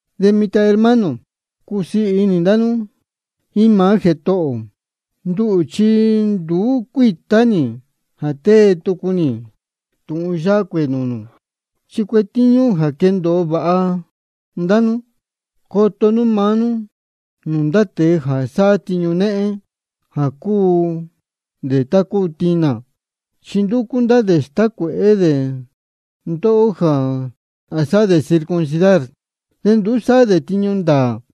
De mitan, hermano, cusiī inī ndá nú jíín maá Jētohō ō. Nduhū chi nduú cuítá nī jā tée tucu nī tūhun yáhá nūū nū, chi cuetíñú jā quendōo vāha cā ndá nú. Coto nú maá nú nūū ndá tēe jā sáhá tiñu néhén, jā cúu dē tá cúu tinā. Chi ndúcú ndá dē stácuēhé dē ndóhó jā sāhá dē circuncidar, de nduú sáhá dē tiñu ndāā.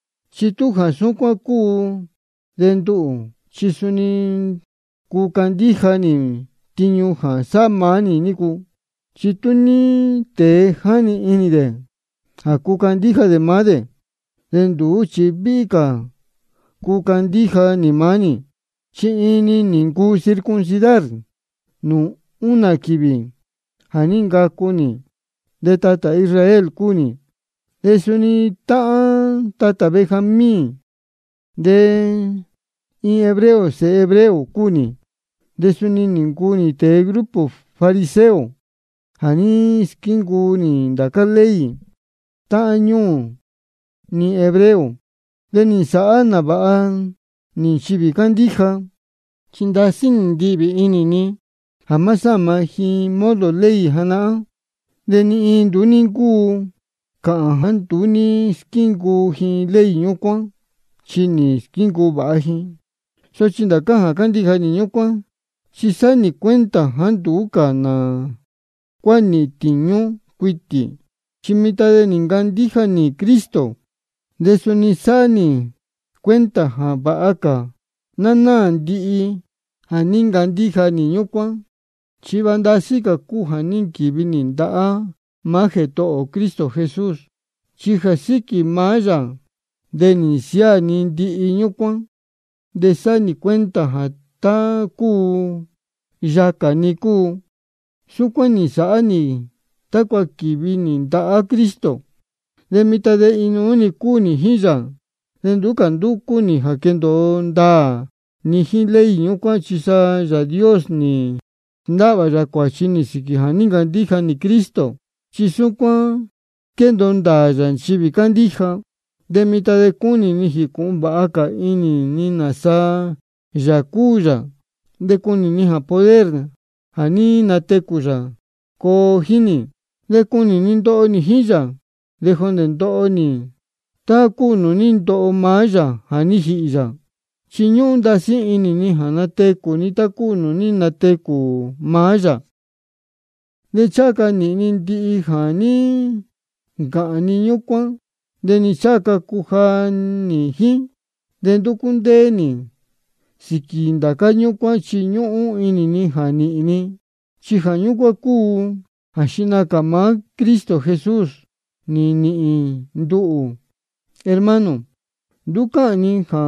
Chi tú jā súcuán cúu de nduhū chi suni cuu candíja nī tiñu jā sáhá maá nī nícu. Chi tú ní tēe jáni inī dē jā cuu candíja dē maá dē, de nduhū chi víhí cā cuu candíja nī maá nī. Chi nī ncuu nī circuncidar nūū únā quīvī jā ní ncacu nī. De tatā Israel cúu nī, de suni táhán tatā Benjamín, de iin hebreo sēhe hebreo cúu nī. De suni nī ncuu nī tēe grupo fariseo jā ní squíncuu nī ndācá ley táhán ñuū ni hebreo. De nī nsāhá nāvāha nī nchivī cándíja, chi ndasí nī ndihvī inī ni jā má sáma ji modo ley janahán. De ni iin nduú ní ncúu cāhān jāá nduú ní squíncuu nī ley ñúcuán, chi nī squíncuu vāha nī. Sochi ndācá jā ní ncandíja nī ñúcuán, chi sáhá nī cuenta jāá nduú nā cuá níhīn tīñú cuitī, chi mitan de nī ncandíja nī Cristo. De suni sáhá nī cuenta jā vāha cā ná náā ndihi jā ní ncandíja nī ñúcuán, chi vāha ndasí cā cúu jā ní nquīvi nī ndahá maá Jētohō ni Cristo Jesús. De jā síquī maá yā de nī nsiáā ni ndihi ñúcuán, de sáhá nī cuenta jā tá cúu yācá-ni cúu. Súcuán nī nsāhá nī tácua quīvi nī ndahá Cristo. De mitan de inuú-ni cúu nī jíín yā. De nduú cā ndúcú nī jā quendōo ndāā ni jíín ley ñúcuán, chi sa Yāā Dios nī sndáhvā yā cuāchi nī sīquī jā ní ncandíja nī Cristo. Chi súcuán squéndōo ndāā yā nchivī cándíja. De mitan de cúnī ni jīcūhun vāha cā inī ni nāsa Yāā cúu yā. De cúnī ni jā poder jā ní natecū yā coo jíín nī. De cúnī ni ndoho nī jíín yā, de jondē ndoho ndihi nī tá cúu nūū ní ndoho maá yā jā ní jīhī yā. Chi ñúhún ndasí inī ni jā natecū ni tá cúu nūū ní natecū maá yā. De ncháha ca nīhīn ni ndihi jā ní ncāhān ni ñúcuán, de ni ncháha ca cuja nī jíín. De ndúcú ndéé nī sīquī ndá ñúcuán, chi ñúhún inī ni jā nīhīn ni, chi jā ñúcuán cúu jā xihna cā maá Cristo Jesús nī nīhīn nduhū. Hermano, nduú cáhān ni jā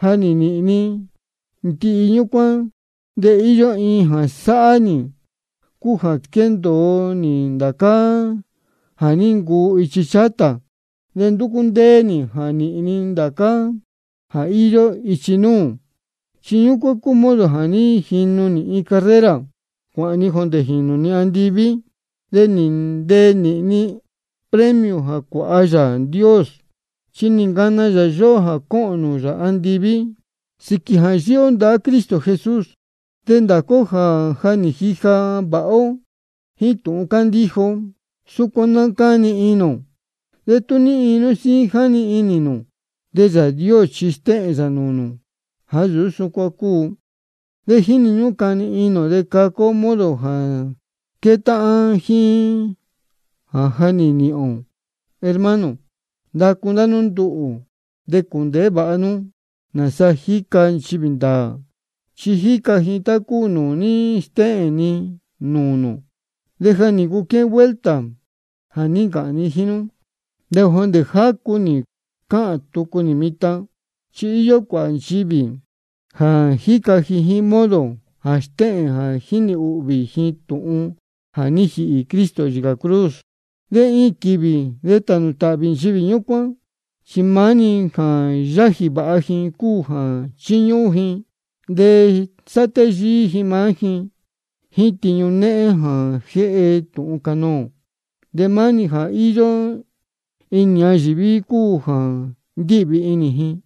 ja nī nīhīn ni ndihi ñúcuán. De íyó iin jā sáhá nī, cúu jā squéndōo nī ndācá jā ní ncuu ichi chátā, de ndúcú ndéé nī jā nīhīn ni ndācá jā íyó ichi núū. Chi cúu ñúcuán modo jā jínu nī iin carrera cuāhān ni jondē jīnū ni andiví, de nīhīn ni premio jā cuāha Yāā Dios. Chi nī ncana yā yóhó jā cōhōn nūū yā andiví sīquī jā yíhí ó ndahá Cristo Jesús. De ndācá ó jā ja nī jija vāha ó jíín tūhun cándíja ó, súcuán ná cáni inī ō. De tú ní iin nú síín jáni inī nū, de Yāā Dios suni stéhēn yā nūū nū jāá nsūú súcuán cúu. De jíni ñúhún cani inī ō de caca ó modo jā quétáhán jíín jā ja nī nīhīn ō. Hermano, ndacu ndá nú nduhū. De cūndēhé vāha nú nāsa jíca nchivī ndāā, chi jíca ji tá cúu nūū ní stéhēn ni nūū nū. De ja nī ncuu quéhén vuelta jā ní ncāhān ni jíín nú, de jondē jácu nī cáhān tucu nī mitan, jā íyó cuāhā nchivī jā jíca ji iin modo jā stéhēn jā jínī ūhvī ji tūhun jā ní jīhī Cristo yīcā cruz. De iin quīvī de tānū tāhvī nchivī ñúcuán. Chi maá-ni jā yájī vāha ji cúu jā chíñúhún ji. De sáhá téyíí ji maá ji jíín tiñu néhén jā jéhe tūhun canoō. De maá-ni jā íyó inī ñayīví cúu jā ndíhvī inī ji.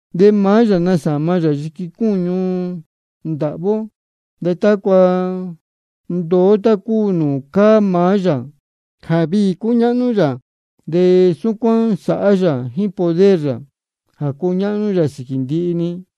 De maá yā nasāma yā yiqui cúñu ndāhví ó, tácua nduu ó tá cúu nūū cáá maá yā jā viī cúñáhnú yā. De súcuán sāhá yā jíín poder yā jā cúñáhnú yā sīquī ndihi-ni.